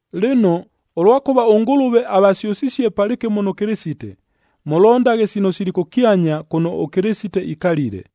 Lɨno, ʉlwakʉva ʉNgʉlʉve avasyʉsisie palɨkɨmo nʉ Kɨlɨsite, mʉlondaghe sino sili kʉkyanya kʉno ʉKɨlɨsite ikalile,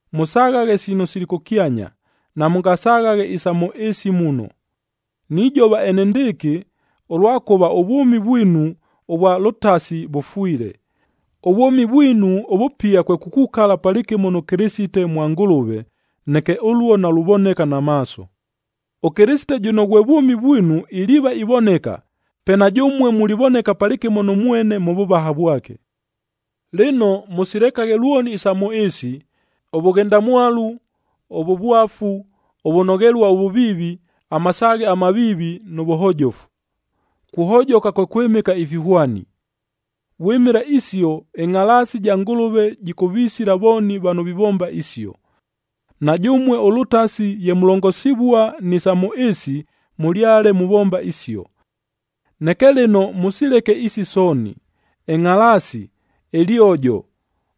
Mʉsaghaghe sino sili kʉkyanya, namʉngasaghaghe isa mʉ ɨɨsi muno. Nijova enendɨɨkɨ, ʉlwakʉva ʉvwʉmi vwinu ʉvwa lʉtasi vʉfwile, ʉvwʉmi vwinu ʉvʉpia kwe kukukala palɨkɨmo nʉ Kɨlɨsite mwa Ngʉlʉve, neke ʉluo naluvoneka na maaso. ɄKɨlɨsite jʉno ghwe vwʉmi vwinu iliiva ivoneka, pe na jʉmue mulivoneka palɨkɨmo nʉ mwene mʉ vʉvaha vwake. Lɨno, mʉsilekaghe lwoni isa mʉ ɨɨsi: ʉvʉghendamwalu, ʉvʉvwafu, ʉvʉnoghelua ʉvʉviivi, amasaaghe amaviivi, nʉ vʉhojofu. Kuhojoka kwe kwɨmɨka ifihwani. Vwɨmɨla isio, ɨngʼhalaasi ja Ngʉlʉve jɨkʉvisila vooni vano vivomba isio. Na jʉmue ʉlʉtasi ye mulongosivua ni sa mʉ ɨɨsi, mʉlyale muvomba isio. Neke lɨno mʉsileke isi sooni: ɨngʼhalaasi, ɨlyojo,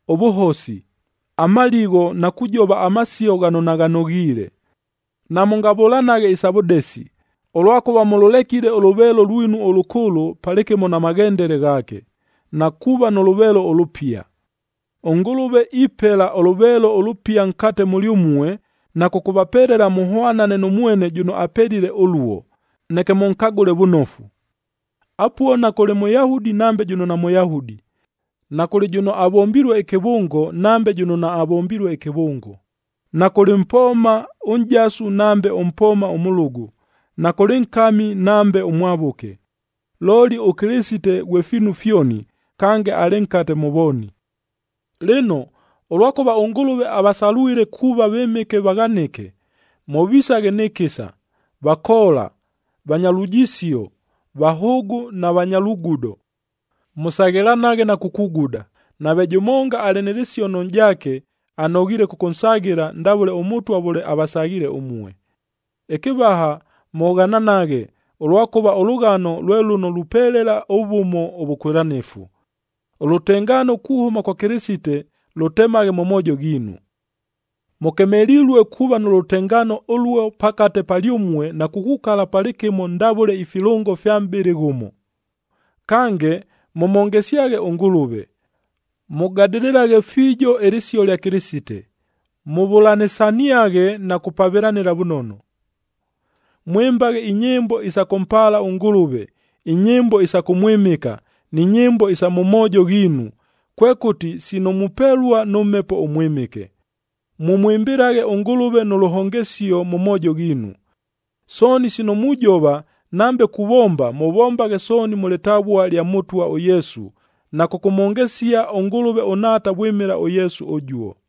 ʉvʉhosi, amaligho na kujova amasio ghano naghanoghiile. Namʉngavʉlanaghe isa vʉdesi, ʉlwakʉva mʉlʉlekile ʉlʉveelo lwinu ʉlʉkʉʉlʉ palɨkɨmo na maghendele ghaake, na kuuva nʉ lʉveelo ʉlʉpia. ɄNgʉlʉve ipela ʉlʉveelo ʉlʉpia nkate mʉlyʉmue, na kʉkʉvapelela mʉhwanane nʉ mwene jʉno apelile ʉluo, neke mʉnkagʉle vʉnofu. Apuo nakʉlɨ Mʉyahudi nambe jʉno naMʉyahudi, nakʉlɨ jʉno avombilue ɨkɨvʉngo nambe jʉno naavombilue ɨkɨvʉngo, nakʉlɨ mpooma ʉnʼjasu nambe ʉmpooma ʉmʉlʉgʉ, nakʉlɨ nkami nambe ʉmwavʉke. Looli ʉKɨlɨsite ghwe fiinu fyoni, kange alɨ nkate mʉ vooni. Lɨno, ʉlwakʉva ʉNgʉlʉve avasalwile kuuva vɨmɨke vaghanɨke, mʉvisaghe nɨ kɨsa, vakoola, vanya lujisio, vahʉʉgʉ na vanya lugudo. Mʉsaghɨlanaghe na kukuguda. Nave jʉmonga alɨ nɨ lɨsio nʉ nʼjaake, anoghiile kʉkʉnsaghɨla ndavʉle ʉMʉtwa vʉle avasaghiile ʉmue. Ɨkɨvaha, mʉghananaghe, ʉlwakʉva ʉlʉghano lwe lʉno lupelela ʉvʉmo ʉvʉkwɨlanɨfu. Ʉlʉtengaano kuhʉma kwa Kɨlɨsite lʉtemaghe mʉ moojo ghiinu. Mʉkemelilue kuuva nʉ lʉtengaano ʉluo pakate palyʉmue na kukukala palɨkɨmo ndavʉle ifilʉngo ifya mʼbɨlɨ ghʉmo. Kange, mʉmhongesyaghe ʉNgʉlʉve. Mʉgadɨlɨlaghe fiijo ɨlɨsio lya Kɨlɨsite, mʉvʉlanɨsaniaghe na kupavɨlanɨla vʉnono. Mwɨmbaghe inyɨmbo isa kʉmpaala ʉNgʉlʉve,b inyɨmbo isa kʉmwɨmɨka, ni nyɨmbo isa mʉ moojo ghiinu, kwekʉti sino mupelua nʉ Mhepo ʉMwɨmɨke. Mʉmwɨmbɨlaghe ʉNgʉlʉve nʉ lʉhongesio mʉ moojo ghiinu. Sooni sino mujova, nambe kuvomba, mʉvombaghe sooni mʉ lɨtavua lya Mʉtwa ʉYesu, na kʉkʉmhongesia ʉNgʉlʉve ʉNhaata vwɨmɨla ʉYesu ʉjuo.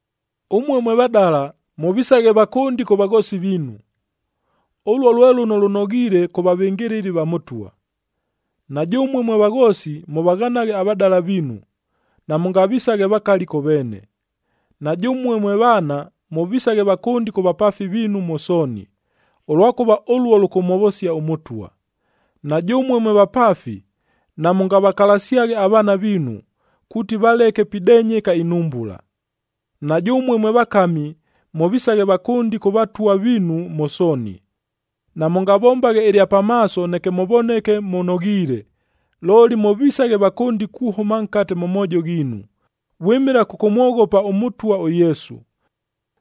Ʉmue mwe vadala, mʉvisaghe vakʉndi kʉ vaghoosi viinu. Ʉluo lwe lʉno lʉnoghiile kʉ vavɨngɨlɨli va Mʉtwa. Na jʉmue mwe vaghoosi, mʉvaghanaghe avadala viinu, namʉngavisaghe vakali kʉ veene. Na jʉmue mwe vaana, mʉvisaghe vakʉndi kʉ vapaafi viinu mʉ sooni, ʉlwakʉva ʉluo lʉkʉmhovosia ʉMʉtwa. Na jʉmue mwe vapaafi, namʉngavakalasyaghe avaana viinu, kuuti valeke pidenyeka inhumbula. Na jʉmue mwe vakami, mʉvisaghe vakʉndi kʉ vatwa viinu mʉ sooni. Namʉngavombaghe ɨlya pamaaso neke mʉvoneke mʉnoghiile, looli mʉvisaghe vakʉndi kuhʉma nkate mʉ moojo ghiinu, vwɨmɨla kʉkʉmwoghopa ʉMʉtwa ʉYesu.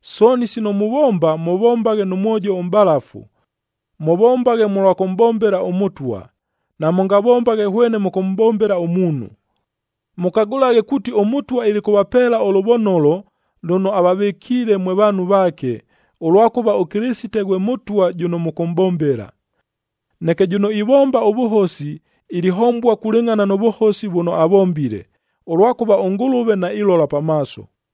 Sooni sino muvomba, mʉvombaghe nʉ mwojo ʉmʼbalafu. Mʉvombaghe mʉlwa kʉmʼbombela ʉMʉtwa, namʉngavombaghe hwene mʉkʉmʼbombela ʉmuunhu. Mʉkagʉlaghe kuuti ʉMʉtwa ilikʉvapeela ʉlʉvonolo lʉno avavɨkiile mwe vaanhu vaake, ʉlwakʉva ʉKɨlɨsite ghwe Mʉtwa jʉno mʉkʉmʼbombela. Neke jʉno ivomba ʉvʉhosi, ilihombua kulɨngʼhana nʉ vʉhosi vʉno avombile, ʉlwakʉva ʉNgʉlʉve nailola pa maaso.